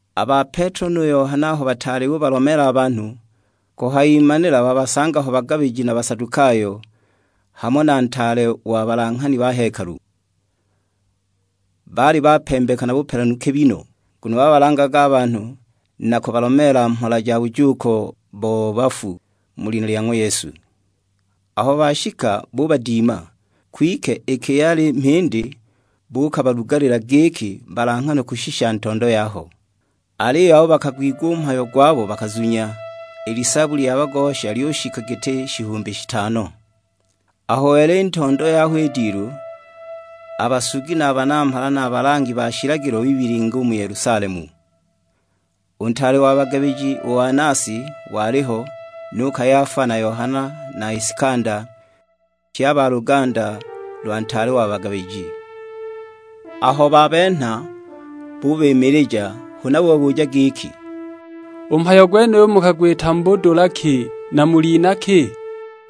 A ba Petelo nu Yohana aho bataali bubalomeela a banhu, kuhayimanila babasanga ho bagabiji na Basadukayo, hamo na ntaale wa balanghani ba hekalu. Baali bapembeka na bupelanu kibi no, nguno babalangaga a banhu na kubalomeela mhola ja bujuuko bo bafu, mu lina lya ng'wa Yesu. Aho bashika bubadima; kwike iki yali mhindi buukabalugalila giki balanghanwe kushisha ntondo yaho. Aliyo abo bakagwigwa u mhayo gwabo bakazunya, i lisaabu lya bagosha lyushika giti shihumbi shitano. Aho wela i ntondo yaho i dilu, a basugi na a banamhala na a balangi ba shilagilo bibilinga u mu Yelusalemu. (U ntaale wa bagabiji, u Anasi, waliho; nu Kayafa, na Yohana na Isikanda; pye a ba luganda lwa ntaale wa bagabiji). Aho babenha bubimilija, huna bubabuja giki, "U mhayo gwenuyo mukagwita mu budula ki, na mu lina ki?"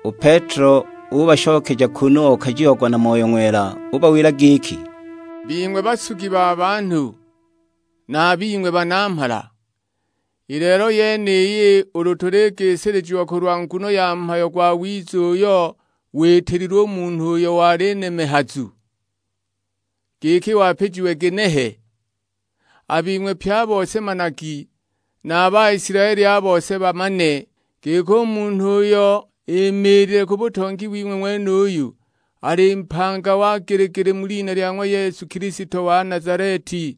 U Petelo ubashokeja kunu okajiagwa na Moyo Ng'wela; ubawila giki, "Bing'we basugi ba banhu, na a bing'we banamhala, i lelo yeniyi ulu tuligisilijiwa kulwa nguno ya mhayo gwawiza uyo witililwe u munhu uyo wali nemehazu, giki wapijiwe ginehe; a bing'we pye a bose managi, na a Baisilaeli a bose bamane, giki u munhu uyo imiilile ku butongi wing'we ng'wenuyu, ali mpanga wa gili-gili mu lina lya ng'wa Yesu Kilisto wa Nazaleti,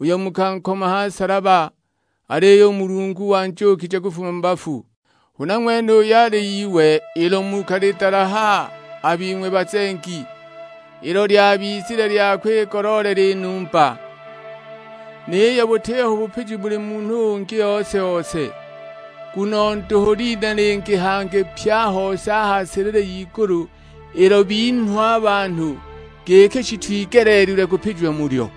uyo mukankoma ha nsalaba; aliyo u Mulungu wanjuukije kufuma mu bafu. Huna ng'wene uyo ali Iwe ilo mukalidalaha a bing'we bazengi, ilo lyabizile lya kwigoloolela i numba. Niyo butiho bupiji muli munhu ungi ose-ose, nguno nduhu lina lingi hangi pye a hose a ha silili y'igulu ilo binhwa a banhu, giki shitwigeleelilwe kupijiwa mulyo."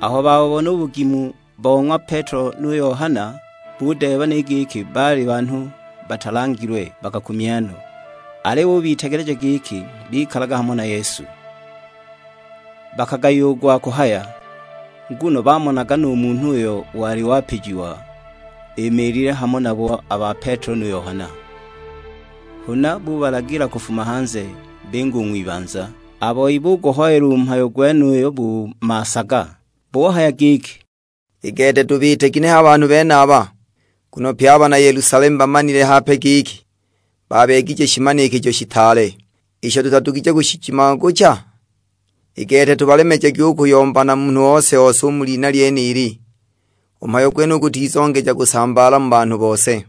Aho babubona u bugimu bo ng'wa Petelo nu Yohana, budeeba ni giki baali banhu batalangilwe, bakakumya no; aliyo bubitegeleja giki bikalaga hamo na Yesu. Bakagayiwa u gwa kuhaya, nguno bamonaga nu munhu uyo wali wapijiwa, imiilile hamo nabo a ba Petelo nu Yohana. Huna bubalagila kufuma hanze, binga u ng'wibanza; a boi buguhoyela u mhayo gwenuyo bu maasaga. Buhaya giki, "I gete tubiite ginehe a banhu benaba? Nguno pye a bana Yelusalemu bamanile hape giki baabeegije shimanikijo shitaale, isho tutadugije kushijimangucha? I gete tubalemejagi u kuyomba na munhu ose-ose u mu lina lyenili, u mhayo gwenuyu gutizongeja kusambaala mu banhu bose."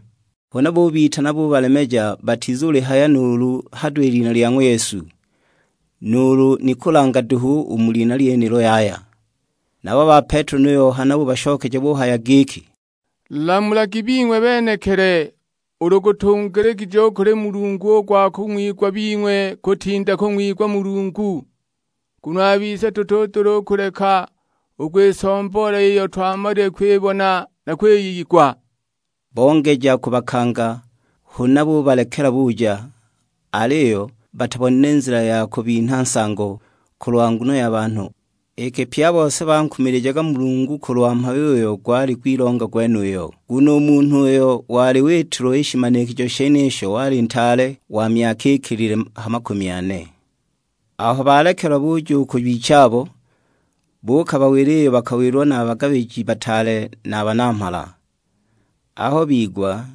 Huna bubitana bubalemeja batizulihaya nuulu hado i lina lya ng'wa Yesu, nuulu ni kulanga duhu u mu lina lyenilo yaya! Nabo a ba Petelo nu Yohana bubashokeja buhaya giki, "Lamulagi bing'we benekili, ulu gutungiligije u kuli Mulungu u gwa kung'wigwa bing'we kutinda kung'wigwa Mulungu. Nguno a bise dutudula u kuleka u kwisomboola iyo twamalile kwibona na kwiyigwa." Bongeja kubakanga, huna bubalekela buja, aliyo batabonile nzila ya kubinha nsango, kulwa nguno ya banhu, iki pye a bose bankumilijaga Mulungu kulwa mhayo uyo gwali gwilonga gwenuyo. Nguno u munhu uyo wali witilwa i shimanikijo shenisho wali ntaale, wa myaka ikilile ha makumi ane. Aho balekelwa buja u ku bichabo, buukabawila iyo bakawilwa na a bagabiji bataale na a banamhala. Aho bigwa,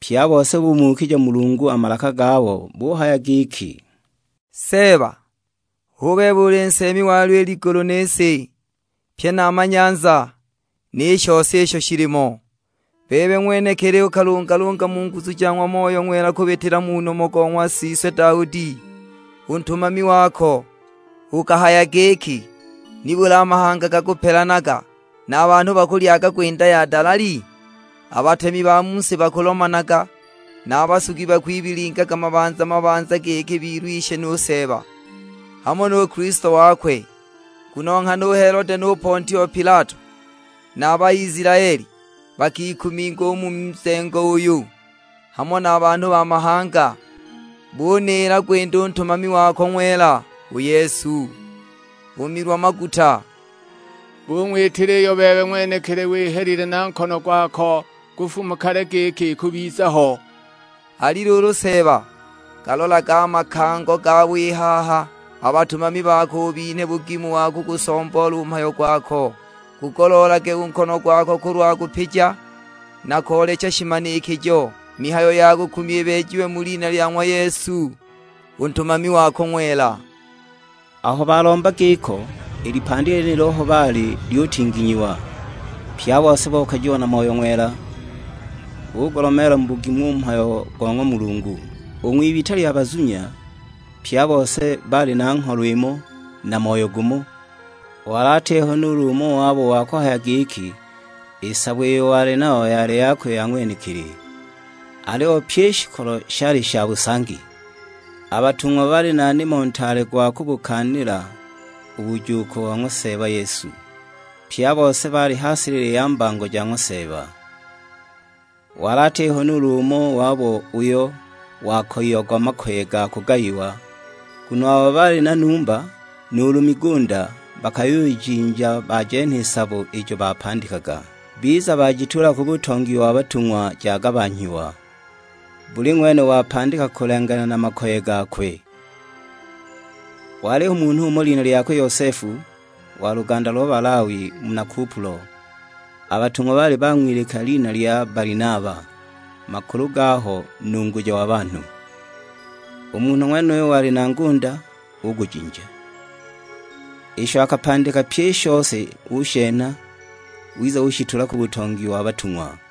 pye a bose bumuukija Mulungu a malaka gabo buhaya giki, "Seeba, hu bebe uli nseemi walyo i ligulu ni si, pye na a manyanza, ni shose isho shilimo. Bebe ng'wenekili ukalungalunga mu nguzu ja ng'wa Moyo Ng'wela kubitila mu nomo go ng'wa siswe Daudi, u ntumami wako; ukahaya giki, 'Nibuli a mahanga gakupelanaga, na a banhu bakulyaga gwinda ya dalali? A batemi ba mu si bakulomanaga; na a basugi bakwibilingaga mabanza mabanza giki bilwishe nu Seeba, hamo nu Kilisto wakwe!' "Nguno nghana u Helode nu Pontio Pilato, na a Baisilaeli, bakikuminga u mu nzengo uyu, hamo na banhu ba mahanga, buniila gwinda u Ntumami wako ng'wela, u Yesu, u Milwa-maguta. Bung'witila iyo bebe ng'wenekili wihelile na nkono gwako kufuma kale giki ikubiza ho. Ali luulu Seeba, galolage a makango gabo i haha, a batumami bako ubinhe bugimu wa kugusomboola u mhayo gwako. Gugoloolage u nkono gwako kulwa kupija, na koolecha shimanikijo; mihayo ya kukumya ibeejiwe mu lina lya ng'wa Yesu, u Ntumami wako ng'wela." Aho balomba giko, i lipandi lyenilo aho baali lyutinginyiwa, pye a bose bokajiwa na Moyo Ng'wela. Bugulomeela mu bugimu u mhayo go ng'wa Mulungu. U ng'wibita lya bazunya, pye a bose baali na ngholo imo, na moyo gumo; wali atiho nuulu umo wabo wa kuhaya giki i sabo iyo wali nayo yali yakwe ya ng'wenekili. Aliyo pyi i shikolo shali sha busangi. A batung'wa baali na nimo ntaale gwa kubukaanila u bujuuko bo ng'wa Seeba Yesu. Pye a bose baali ha silili ya mbango ja ng'wa Seeba. Wali atiho nuulu umo wabo uyo wakoyiagwa makoye ga bugayiwa, nguno abo baali na numba nuulu migunda bakayujinja bajenha i sabo ijo bapandikaga, biza bajituula ku butongi wa batung'wa jagabanhyiwa; buli ng'wene wapandika kulenganila na makoye gakwe. Waliho munhu umo lina lyakwe Yosefu; wa luganda lo Balawi, muna Kupulo. A batung'wa baali bang'wilika lina lya Balinaba, makulu gaho nunguja wa banhu. U munhu ng'wenuyo wali na ngunda, ugujinja; isho akapandika pyi i shose ushenha, wiza ushituula ku butongi wa batung'wa.